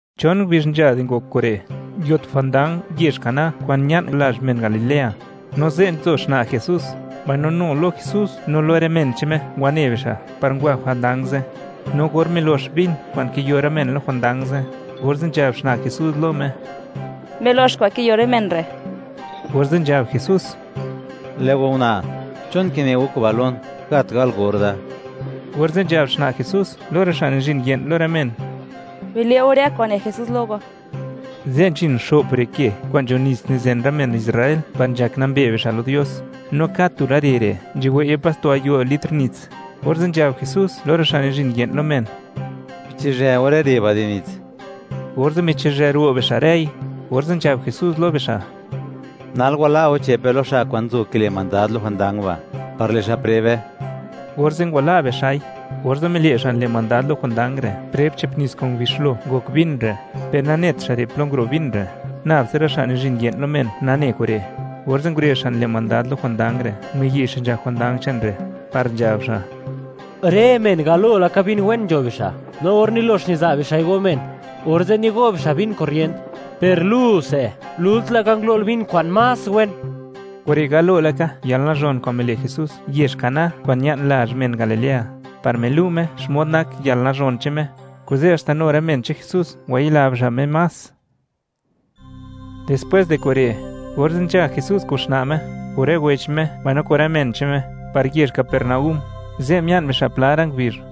Chon ngubizh nzha di ngok kure', nguio tu jwandang yezh Caná kwa'n ña'n lazh men Galilea. No ze' nzo xna' Jesús, mbaino nu lo Jesús no lo rë men che'n Me ngwane bixa' par ngwa jwandang ze'. No or milox vin kwa'n kiyo rë men lo jwandang ze', orze' nzhab xna' Jesús lo Me: ―Milox kwa'n kiyo rë men re'. Orze' nzhab Jesús: ―Lë' go una', ¿chon kine go kuba' lon? Gat gal or da. Orze' nzhab xna' Jesús lo rë xa' nizhin ye'n lo rë men: ―Bile' go rë kwa'n ne Jesús lo go. Ze' nzhin xo'p re ke kwa'n nzho nits kwa'n nizen rë men Israel par nzhak nambe bixa' lo Dios. No kad tu rë re re' nzhuwei'ye pas tu gayo' litr nits. Orze' nzhab Jesús lo rë xa' nizhin ye'n lo men: ―Bichizhë go rë re ba' di nits. Orze' michizhë ro' bixa' rëi, orze' nzhab Jesús lo bixa': ―Nal wala' go che'pe lo xa' kwa'n nzo kile' mandad lo jwandang ba', par le' xa' prebe. Orze' ngwala' bixa'i. Orze' mile' xa' nile' mandad lo jwandang re' preb che'p nits kwa'n ngubixlo ngok vin re', per nanet xa' re' plo nguro' vin re', nab tsa rë xa' nizhin ye'n lo men nane kure'. Orze' ngurezh xa' nile' mandad lo jwandang re' miyi' xa' nzhak jwandang che'n re', par nzhab xa': ―Rë men galo laka vin wen nzho bixa', no or nilox niza' bixa'i go men, orze' nigo' bixa' vin korrient; per lu se, lult laka ngulo'l vin kwa'n más wen. Kure' galo laka yalnazhon kwa'n mile' Jesús yezh Caná kwa'n ña'n lazh men Galilea, par milu' Me xmod nak yalnazhon che'n Me; kuze' haxta nu rë men che'n Jesús ngwayila bixa' Me más. Dispwés di kure', orze' nzha Jesús kun xna' Me, kun rë wech Me mbaino kun rë men che'n Me, par yezh Capernaúm; ze' mia'n bixa' pla ra' ngubizh.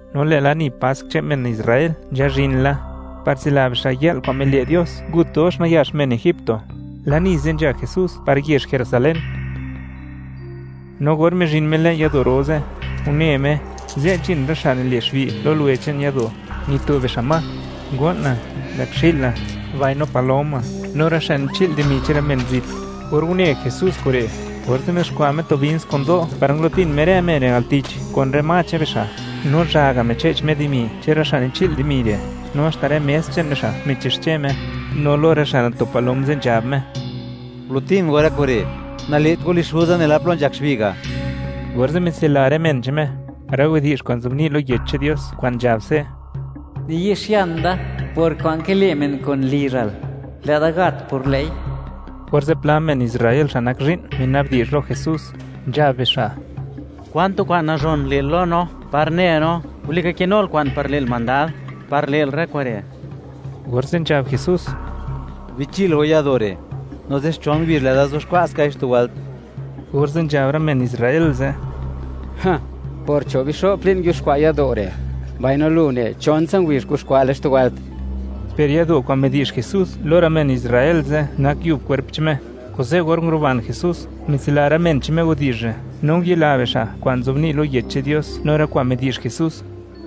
No lë' lani Pask che'n men Israel nzhazhin la, par tsila bixa' yë'l kwa'n mile' Dios ngut dox nayax men egipto; lani ze' nzha Jesús par yezh Jerusalén. No or mizhin Me le'n yado' ro ze', une Me, ze' nzhin rë xa' nile' xbi' lo luwe che'n yado', nito bixa' ma: ngo'na, mbëkxi'la, mbaino paloma; no rë xa' nichi'l dimi che'n rë men zit. Or une Jesús kure', orze' mizuxkwa' Me tu bins kun do' par ngulo'tin Me rë men re' al tich kun rë ma che'n bixa'; no zhaga' miche'ch Me dimi che'n rë xa' nichi'l dimi re', no haxta rë mes che'n bixa' michixche Me. No lo rë xa' nito palom ze' nzhab Me: ―¡Gulo'tin go rë kure'! ¡Nale't go lizh Xuza nela plo nzhak xbi' ga'! Orze' mitsila rë men che'n Me rë widi'zh kwa'n nzobni' lo Yech che'n Dios kwa'n nzhab se': “Niyi'xian da por kwa'n kile' men kun lizhal; lë'da gat por lë'i.” Orze' pla men Israel xa' nak zhi'n, mina'bdi'zh lo Jesús, nzhab bixa': ―¿Kwan tu kwa'n nazhon le'l lo no par ne no, walika kinul kwa'n par le'l mandad, par le'l rë kure'? Orze' nzhab Jesús: ―Bichil go yado' re', no zixchon ngubizh lë'da zuxkwa' skai xtu wëlt. Orze' nzhab rë men Israel ze': ―Por cho' bixo'p li'n nguiuxkwa' yado' re', mbaino lu ne, ¡chon tsa ngubizh kuxkwa'le xtu wëlt! Per yado' kwa'n midi'zh Jesús lo rë men Israel ze' nak yub kwerp che'n Me. Kuze', or nguruban Jesús, mitsila rë men che'n Me widi'zh re', no ngwayila bixa' kwa'n nzobni' lo Yech che'n Dios no rë kwa'n midi'zh Jesús.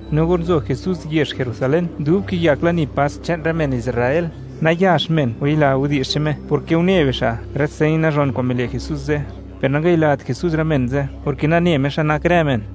No or nzo Jesús yezh Jerusalén dub kiyak lani Pask che'n rë men Israel, nayax men ngwayila widi'zh che'n Me porke une bixa' rë señ nazhon kwa'n mile' Jesús ze'. Per nangayilat Jesús rë men ze', porke nane Me xmod nak rë men.